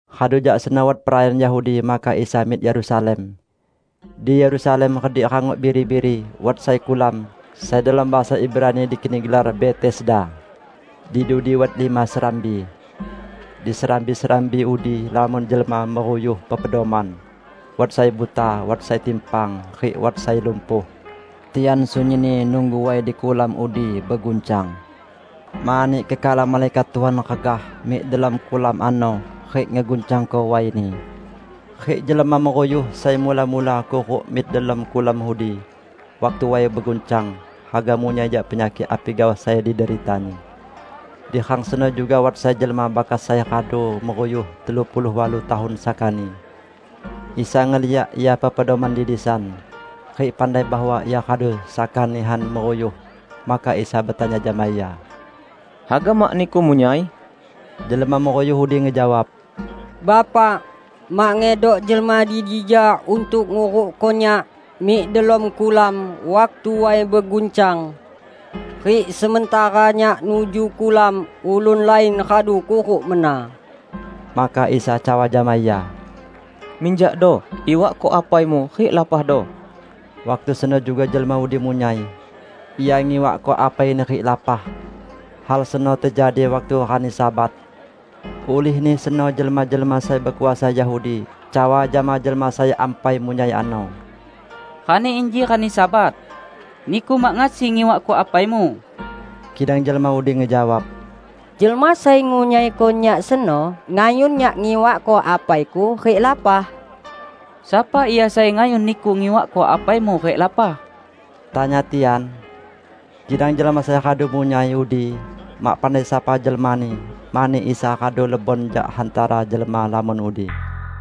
Radu jak seno wat perayaan Yahudi, maka Isa mik Yerusalem. Di Yerusalem redik "Rangok Biri-biri" wat sai kulam, sai delom bahasa Ibrani dikeni gelar Betesda. Di dudi wat lima serambi. Di serambi-serambi udi lamon jelma meruyuh pepedoman; wat sai buta, wat sai timpang, rik wat sai lumpuh. [Tian sunyinni nunggu way di kulam udi beguncang. Mani kekala malaikat Tuhan regah mik delom kulam ano rik ngeguncangko wayni. Rik jelma meruyuh sai mula-mula kuruk mik delom kulam udi waktu way beguncang haga munyai jak penyakik api gaoh sai dideritani.] Di rang seno juga wat sai jelma bakas sai radu meruyuh telu puluh walu tahun sakani. Isa ngeliak ia pepedoman di disan, rik pandai bahwa ia radu saka nihan meruyuh; maka Isa betanya jama ia, "Haga mak niku munyai?" Jelma meruyuh udi ngejawab, "Bapak, mak ngedok jelma di dija untuk ngurukko nyak mik delom kulam waktu way beguncang. Rik sementara nyak nuju kulam, ulun lain radu kuruk mena." Maka Isa cawa jama ia, "Minjakdo, iwakko apaimu rik lapahdo." Waktu seno juga jelma udi munyai. Ia ngiwakko apaini rik lapah. Hal seno tejadi waktu rani Sabat. Ulihni seno jelma-jelma sai bekuasa Yahudi cawa jama jelma sai ampai munyai ano, "Rani inji rani Sabat. Niku mak ngasi ngiwakko apaimu." Kidang jelma udi ngejawab, "Jelma sai ngunyaiko nyak seno ngayun nyak ngiwakko apaiku rik lapah." "Sapa Ia sai ngayun niku ngiwakko apaimu rik lapah?" tanya tian. Kidang jelma sai radu munyai udi mak pandai sapa jelmani, mani Isa radu lebon jak hantara jelma lamon udi.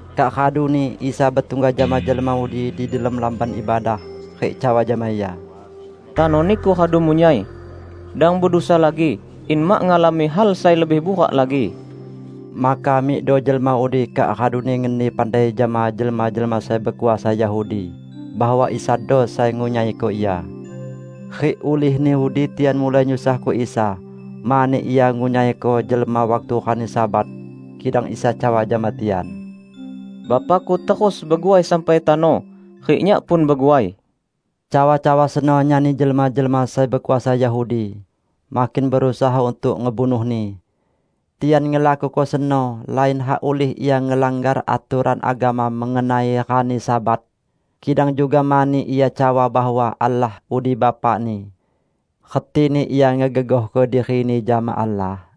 Kak raduni Isa betungga jama jelma udi di delom Lamban Ibadah, rik cawa jama ia, "Tano niku radu munyai. Dang bedusa lagi, in mak ngalami hal sai lebih burak lagi." Maka mikdo jelma udi kak raduni ngeni pandai jama jelma-jelma sai bekuasa Yahudi bahwa Isado sai ngunyaiko ia. Rik ulihni udi tian mulai nyusahko Isa, mani Ia ngunyaiko jelma waktu rani Sabat. Kidang Isa cawa jama tian, "Bapa-Ku terus beguai sampai tano, rik Nyak pun beguai." Cawa-cawa seno nyani jelma-jelma sai bekuasa Yahudi makin berusaha untuk ngebunuh-Ni. Tian ngelakuko seno, lain hak ulih Ia ngelanggar atoran agama mengenai rani Sabat, kidang juga mani Ia cawa bahwa Allah udi Bapa-Ni; retini Ia ngegegohko diri-Ni jama Allah.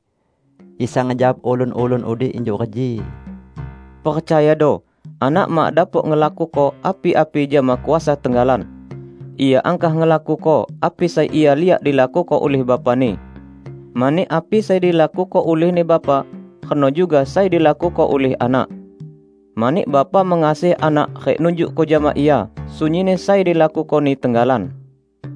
Isa ngejawab ulun-ulun udi injuk reji, "Percayado, Anak mak dapok ngelakuko api-api jama kuasa tenggalan. Ia angkah ngelakuko api sai Ia liak dilakuko ulih Bapa-Ni. Mani api sai dilakuko ulihni Bapa, reno juga sai dilakuko ulih Anak. Mani Bapa mengasihi Anak rik nunjukko jama Ia sunyinni sai dilakuko-Ni tenggalan.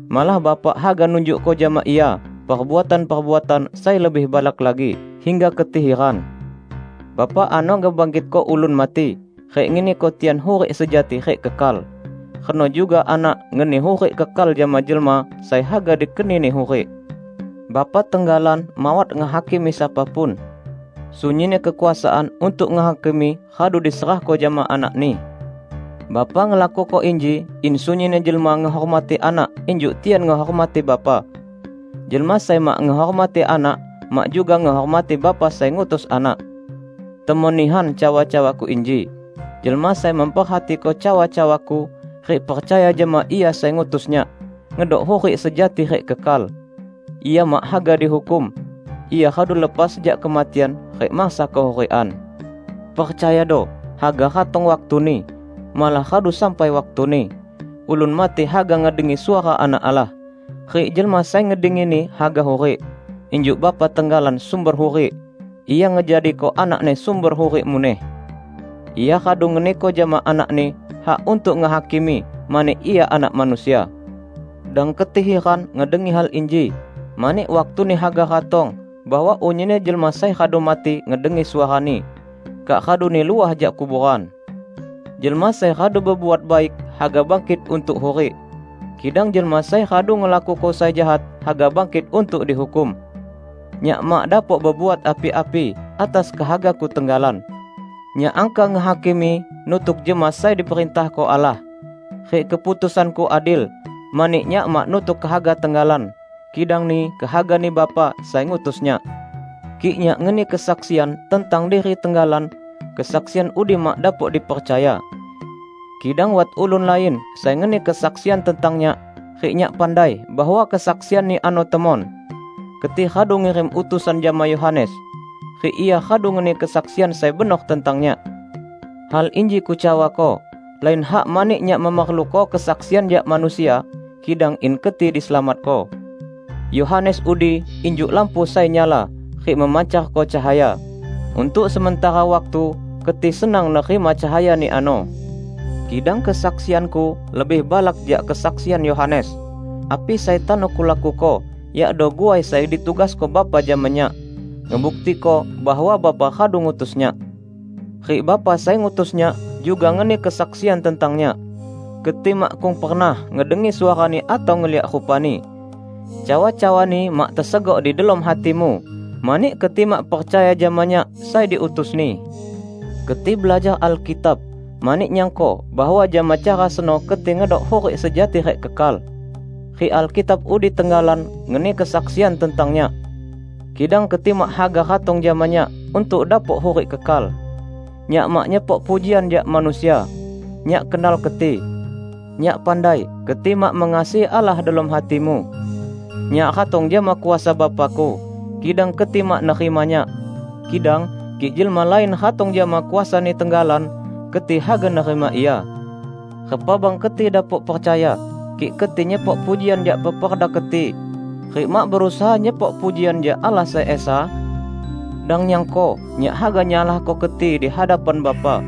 Malah Bapa haga nunjukko jama Ia perbuatan-perbuatan sai lebih balak lagi, hingga keti hiran. Bapa ano ngebangkitko ulun mati, rik ngeniko tian hurik sejati rik kekal; reno juga Anak ngeni hurik kekal jama jelma sai haga dikeni-Ni hurik. Bapa tenggalan mawat ngehakimi sapa pun. Sunyinni kekuasaan untuk ngehakimi radu diserahko jama Anak-Ni. Bapa ngelakuko inji in sunyinni jelma ngehormati Anak injuk tian ngehormati Bapa. Jelma sai mak ngehormati Anak mak juga ngehormati Bapa sai ngutus Anak. Temon nihan cawa-cawa-Ku inji: Jelma sai memperhatiko cawa-cawa-Ku, rik percaya jama Ia sai ngutus Nyak, ngedok hurik sejati rik kekal. Ia mak haga dihukum; ia radu lepas jak kematian rik mansa kehurikan. Percayado: Haga ratong waktuni -- malah radu sampai waktuni -- ulun mati haga ngedengi suara Anak Allah. Rik jelma sai ngedengini haga hurik. Injuk Bapa tenggalan sumber hurik, Ia ngejadiko Anak-Ni sumber hurik muneh. Ia radu ngeniko jama Anak-Ni hak untuk ngehakimi, mani Ia Anak Manusia. Dang keti hiran ngedengi hal inji, mani waktuni haga ratong bahwa unyinni jelma sai radu mati ngedengi suara-Ni, kak raduni luah jak kuboran. Jelma sai radu bebuat baik haga bangkit untuk hurik. Kidang jelma sai radu ngelakuko sai jahat haga bangkit untuk dihukum." "Nyak mak dapok bebuat api-api atas kehaga-Ku tenggalan. Nyak angkah ngehakimi nutuk jama sai diperintahko Allah. Rik keputusan-Ku adil, mani Nyak mak nutuk kehaga tenggalan, kidangni kehagani Bapa sai ngutus Nyak. Kik Nyak ngeni kesaksian tentang diri tenggalan, kesaksian udi mak dapok dipercaya. Kidang wat ulun lain sai ngeni kesaksian tentang Nyak, rik Nyak pandai bahwa kesaksian-Ni ano temon. Keti radu ngirim utusan jama Yohanes, rik ia radu ngeni kesaksian sai benor tentang Nyak. Hal inji Kucawako, lain hak mani Nyak memerluko kesaksian jak manusia, kidang in keti diselamatko. Yohanes udi injuk lampu sai nyala rik memancarko cahaya. Untuk sementara waktu keti senang nerima cahayani ano. Kidang kesaksian-Ku lebih balak jak kesaksian Yohanes. Api sai tano Kulakuko, yakdo guai sai ditugasko Bapa jama Nyak, ngebuktiko bahwa Bapa radu ngutus Nyak. Rik Bapa sai ngutus Nyak juga ngeni kesaksian tentang Nyak. Keti makkung pernah ngedengi suara-Ni atau ngeliak rupa-Ni. Cawa-cawa-Ni mak tesegok di delom hatimu mani keti mak percaya jama Nyak sai diutus-Ni. Keti belajar Alkitab mani nyangko bahwa jama cara seno keti ngedok hurik sejati rik kekal. Rik Alkitab udi tenggalan ngeni kesaksian tentang Nyak. Kidang keti mak haga ratong jama Nyak untuk dapok hurik kekal. Nyak mak nyepok pujian jak manusia. Nyak kenal keti. Nyak pandai keti mak mengasihi Allah delom hatimu. Nyak ratong jama kuasa Bapa-Ku, kidang keti mak nerima Nyak. Kidang kik jelma lain ratong jama kuasani tenggalan, keti haga nerima ia. Repa bang keti dapok percaya, kik keti nyepok pujian jak peperda keti, rik mak berusaha nyepok pujian jak Allah sai Esa? Dang nyangko Nyak haga nyalahko keti di hadapan Bapa.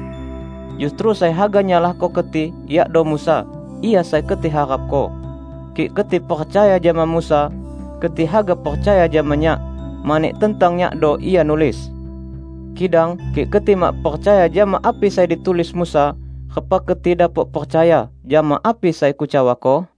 Justru sai haga nyalahko keti yakdo Musa, ia sai keti harapko. Kik keti percaya jama Musa, keti haga percaya jama Nyak, mani tentang Nyakdo ia nulis. Kidang kik keti mak percaya jama api sai ditulis Musa, repa keti dapok percaya jama api sai Kucawako?"